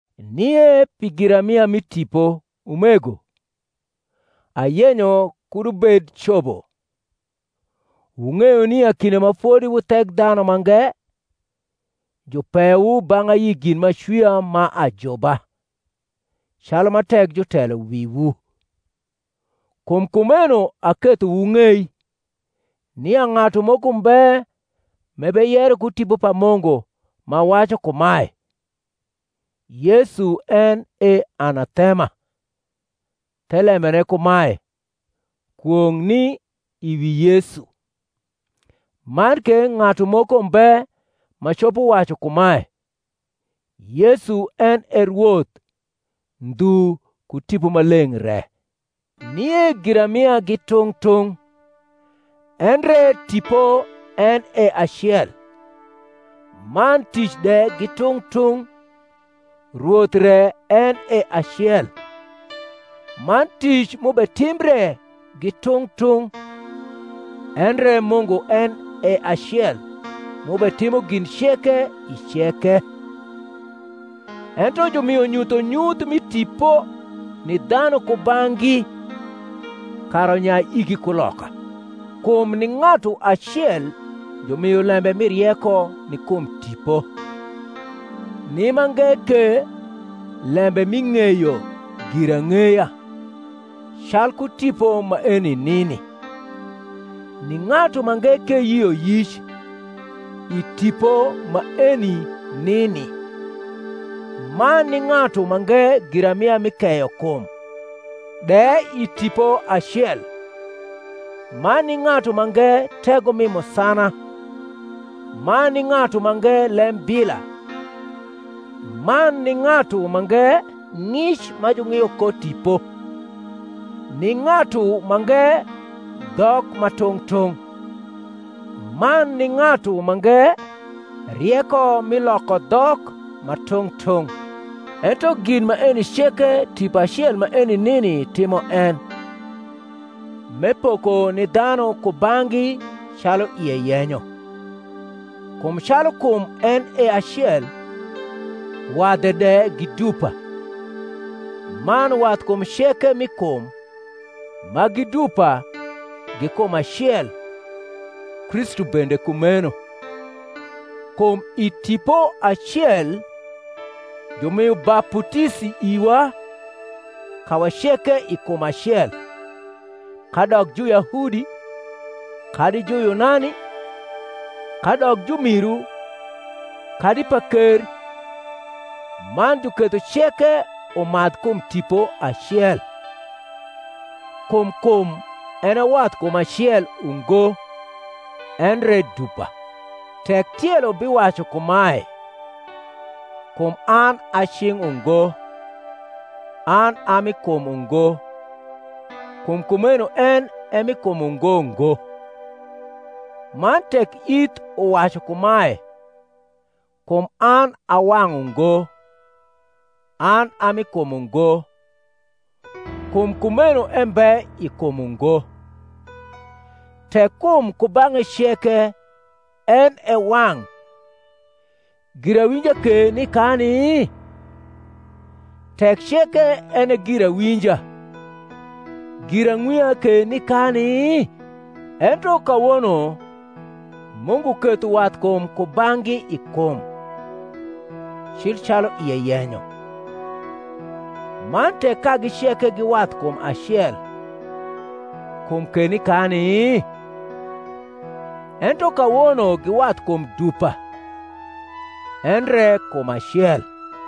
Nie pi giramia mi tipo, umego, ayenyo kud wubed cobo. Wung’eyo nia kinde ma fodi wu Thekdhanumange jupeyowu bang’ ayi gin m’acwia ma ajuba, calu ma tek jutelo wiwu. Kum kumeno aketho wung’ei, nia ng’atu moko mbe m’ebeyero ku Tipo pa Mungu ma wacu kumae, Yesu en e Anathema; (thelembene kumae, Kwong’ ni i wi Yesu); man ke ng’atu moko mbe ma copo wacu kumae, Yesu en e Rwoth, ndhu ku Tipo Maleng’ re. Nie giramia gi tung’ tung’, endre Tipo en e acel. Man tic de gi tung’ tung’, Rwoth re en e acel. Man tic m’ubetimbre gi tung’ tung’, endre Mungu en e acel, m’ubetimo gin ceke i ceke. Ento jumio nyuthonyuth mi Tipo ni dhanu kubang’gi kara unyai igi kuloka. Kum ni ng’atu acel jumio lembe mi rieko ni kum Tipo; ni mange ke lembe mi ng’eyo girang’eya, calku Tipo maeni nini: ni ng’atu mange ke yioyic, i Tipo maeni nini, man ni ng’atu mange giramia mi keyokum, de i Tipo acel; man ni ng’atu mange tego mi musana; man ni ng’atu mange lembila; man ni ng’atu mange ng’ic ma jung’io ko tipo: ni ng’atu mange dhok ma tung’ tung’; man ni ng’atu mange rieko mi loko dhok ma tung’ tung’: ento gin maeni ceke Tipo acel maeni nini timo en, m’epoko ni dhanu kubang’gi calu ie yenyo. Kum calu kum en e acel, wadhe de gi dupa, man wathkum ceke mi kum, ma gi dupa, gi kum acel; Kristu bende kumeno. Kum i Tipo acel jumio baputisi iwa kawa ceke i kum acel, kadok Juyahudi kadi Juyunani, kadok jumiru kadi paker; man juketho ceke umadh kum Tipo acel. Kum kum en e wathkum acel ungo, endre dupa. Tek tielo biwacu kumae, Kum an a cing’ ungo, an a mi kum ungo; kum kumeno en e mi kum ungo ngo. Man tek ith uwacu kumae, Kum an a wang’ ungo, an a mi kum ungo; kum kumeno embe i kum ungo. Tek kum kubang’e ceke en e wang’, girawinja ke ni kani? Tek ceke en e girawinja, girang’wia ke ni kani? Ento kawono Mungu ketho wathkum kubang’gi i kum, cil calu ie yenyo. Man tek kagi ceke gi wathkum acel, kum ke ni kani? Ento kawono gi wathkum dupa, endre kum acel.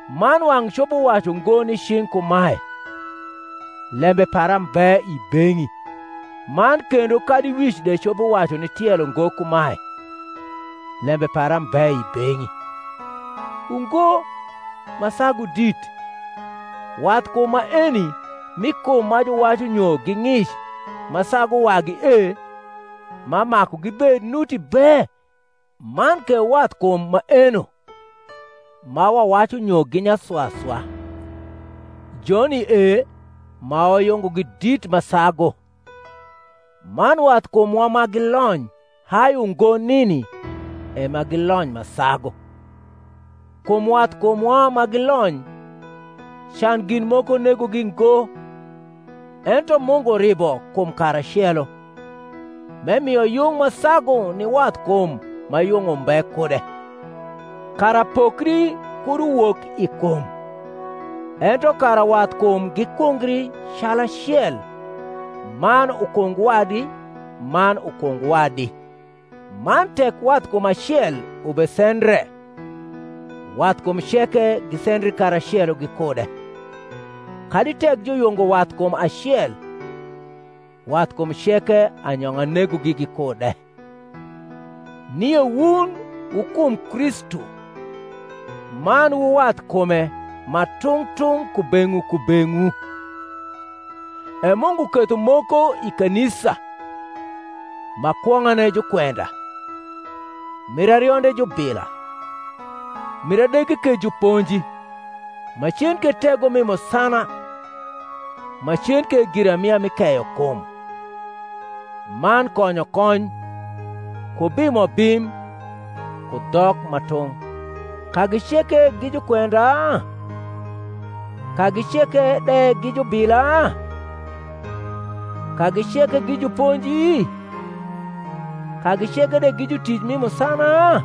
Man wang’ copo wacu ngo ni cing’ kumae, Lembe para mbe i beng’i: man kendo kadi wic de copo wacu ni tielo ngo kumae, Lembe para mbe i beng’i. Ungo, ma sagu dit, wathkum maeno mi kum ma juwacu nyo gi ng’ic ma sagu wagi e ma maku gibed nuti be: man ke wathkum maeno, ma wawacu nyo gi nyaswaswa, joni e ma wayungogi dit ma sagu: man wathkumwa ma gilony hai ungo nini e ma gilony ma sagu; kum wathkumwa ma gilony can gin moko negogi ngo: ento Mungu ribo kum karacelo, m’emio yung ma sagu ni wathkum ma yung umbe kude; kara pokri kud uwok i kum; ento kara wathkum gikungri calacel man ukung wadi man ukung wadi. Man tek wathkum acel ubesendre, wathkum ceke gisendri karacelo gikude; kadi tek juyungo wathkum acel, wathkum ceke anyong’a negogi gikude. Nie wun wu kum Kristu, man wu wathkume ma tung’ tung’ kubeng’wu kubeng’wu. E Mungu ketho moko i kanisa, ma kwong’ane jukwenda, mir arionde jubila, mir adege ke juponji, macen ke tego mi musana, macen ke giramia mi keyo kum, man konyokony, ku bimobim, ku dhok ma tung’. Kagi ceke gi jukwenda? kagi ceke de gi jubila? kagi ceke gi juponji? kagi ceke de gi jutic mi musana?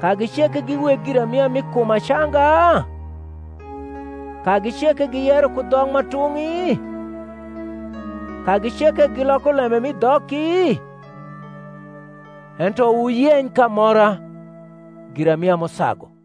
kagi ceke gi weg giramia mi kum acanga? kagi ceke giyero ku dhok ma tung’i? kagi ceke giloko lembe mi dhoki? Ento wuyeny k’amora giramia m’usagu.